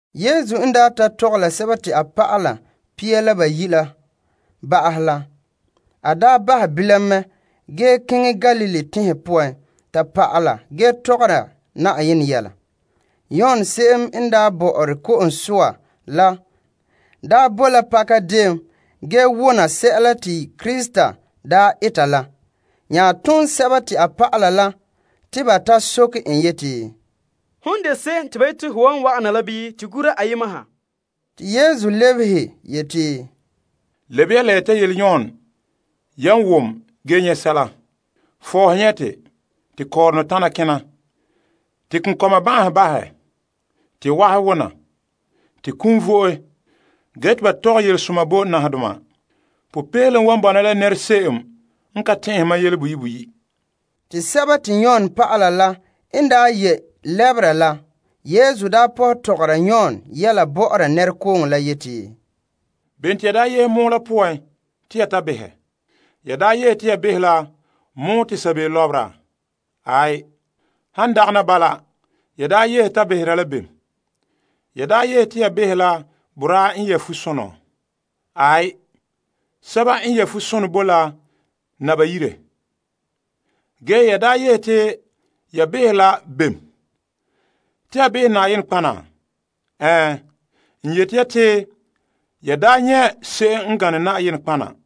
Yesu n daa ta tɔgɛ la a dɔlɔba la pia la bayi' la ba'ahɛ la, a bahɛ bilam mɛ ge keŋɛ Galilee teŋhe poan ta pa'ala ge mɔɔla. Yon n daa boe la pakadeen ge wona sɛla te Krista eta la, a tom a dɔlɔba la te ba ta soke en yeti, Hom n de se'em te ba yeti ho wan wa'ana la bii to gura ayema ha? Te Yesu lebehe yeti, Lebe ya la ya ta yele Yon yan wa wom ge nyɛ' sɛla la. Fɔɔhe nyɛte, te kɔɔrɔnɔ tana kena, te konkɔma ban'ahe bahɛ, te wahe wona, te kum vo'e ge te ba tɔgɛ yelesoma bo nahadoma. Popeelom wan bɔna la nɛra se'em n ka tɛn'ɛhe mam yele boyi' boyi'. Te Yon dɔlɔba n ye' lɛbera la, Yesu daa pɔhɛ tɔgɔra Yon yɛla bɔ'ɔra nɛrekooŋɔ la yeti, Bem te ya yehe pɔgɔtia la poan te ya behɛ? Ya yehe te ya behɛ la pɔgɔtia te sabeeo lɔbera? Han dagana bala, ya yehe ta beha la bem? Ya yehe te ya behɛ la boraa nyɛ' fusonɔ? Aai, sɛba n yɛ' fusonɔ bo la naba yire. Ge ya yehe te ya behɛ la bem? Te ya behɛ nɔtɔgɔha? Ɛɛn, n yeti ya te ya daa nyɛ' se'em n gane nɔtɔgɔha.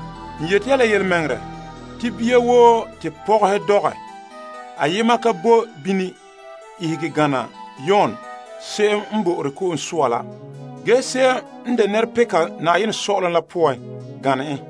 N yeti ya la yelemɛŋɛrɛ te bia woo te pɔgɔhe dɔgɛ, ayema ka bo bini ihege gana Yon Ko'sɔɔra la, ge se'em n de nɛrepeka saazuo sɔ'ɔlom la poan gane en.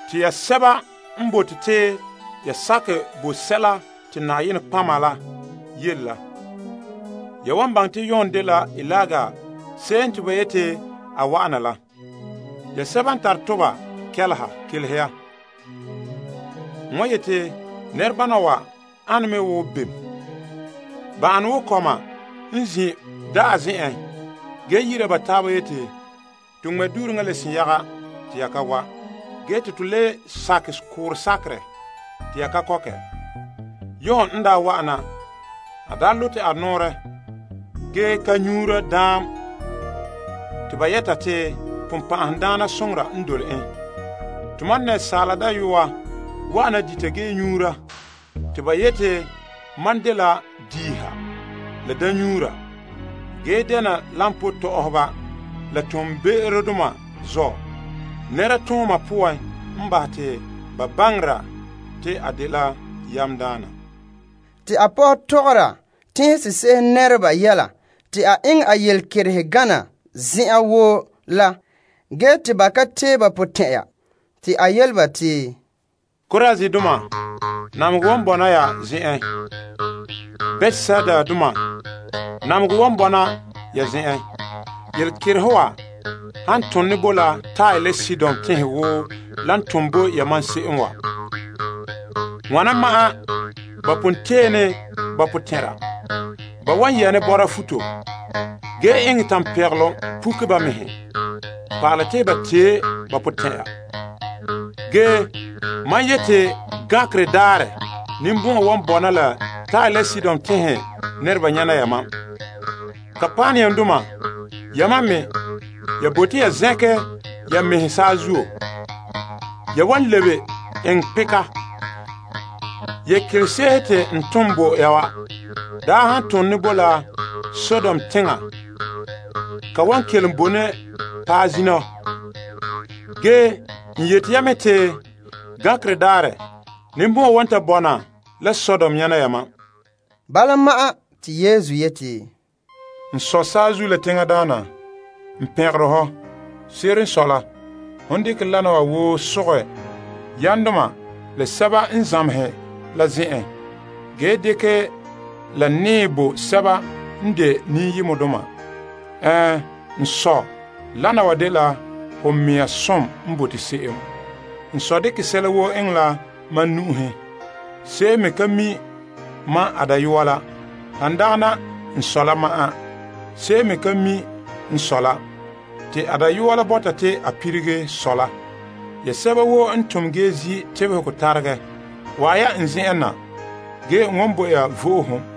Te ya sɛba n bote te ya to'e ka, ya wan baŋɛ te Yon dela Eliya se'em te ba yeti a wa'ana la. Ya sɛba n tare toba kɛleha, kelehe ya. N wan yeti nɛrebana wa ane mɛ wo bem? Ba an wo kɔma n zin' da'a zen'en ge yi'ira ba taaba yeti, To ŋmɛ' duureŋa te ya ka wa', ge te to le sakɛ koorɛ sakerɛ te ya ka kɔkɛ. Yon n daa wa'ana, a daa zagahɛ a mɛŋa ge ka nyuura daam, te ba yɛta te bonbɛ'ɛhe n dole en. Te Asaala Dayɔa wa'ana dita ge nyuura, te ba yeti mam dela diiha la daamnyuura ge dena koba tɔ'ɔhɔba la be'emdoma zɔ'. Nɛra tooma poan n bahɛ te ba baŋera te a dela yamdaana. Te Yesu pɔhɛ tɔgɔra teŋse'ehe nɛreba yɛla te a eŋɛ a yelekerehe gana zen'an woo la, ba ka tee ba potɛn'ɛra la zuo. Korazindoma, namehegɔ wan bɔna ya zen'en. Betsaidadoma, namehegɔ wan bɔna ya zen'en. Yelekerehe wa han ton ne bo la Tire la Sidon teŋhe wo lan ton bo yamam se'em wa, wana ma'an ba pon yɛ' ne sunsagaŋɔ futo ge eŋɛ tampegelom puke ba mɛhe pa'alɛ te ba tee ba potɛn'ɛra. Ge mam yeti gankerɛ daarɛ ninbɔn'ɔn wan bɔna bo Tire la Sidon teŋhe nɛreba nyana yamam. Kapernaumdoma, yamam me, ya bote ya zɛnkɛ ya mɛhe saazuo? Ya wam sige namehegɔ zen'en la. Yelekerese'ehe n tom bo ya wa daa han ton ne boe la Sodom teŋa, ka wan kelom boe ne paɛ zina wa. Ge n yeti ya me te gankerɛ daarɛ ninbɔn'ɔn wan ta bɔna la Sodom nyana yamam. Bala ma'an te Yesu yeti, N Sɔ', saazuo la teŋa Daana, n pɛngere hɔ. Se'ere n sɔe, hon dekɛ wana wa woo sogɛ yamdoma la zamehɛdoma la zen'en ge dekɛ dɛ nɛɛ bo kɔma. Ɛɛn, n Sɔ', wana wa dela ho mɛŋa som n bote se'em. N Sɔ' daa dekɛ sɛla woo eŋɛ la mam nu'uhen. Se'em me ka mi' mam a Dayɔa la, han dagana n Sɔ' la ma'an. Se'em me ka mi' n Sɔ' la, han dagɛna a Dayɔa la sɛba te a bɔta te a lilige Sɔ' la bo ba. Ya sɛba woo n tom gee zi' tebehegɔ taregɛ, wa'an ya n zen'en na ge n wan bo ya vo'ohogo.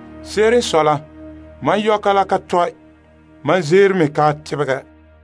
Se'ere n sɔe la, mam yɔka la ka tɔe, mam zeero me ka tebegɛ.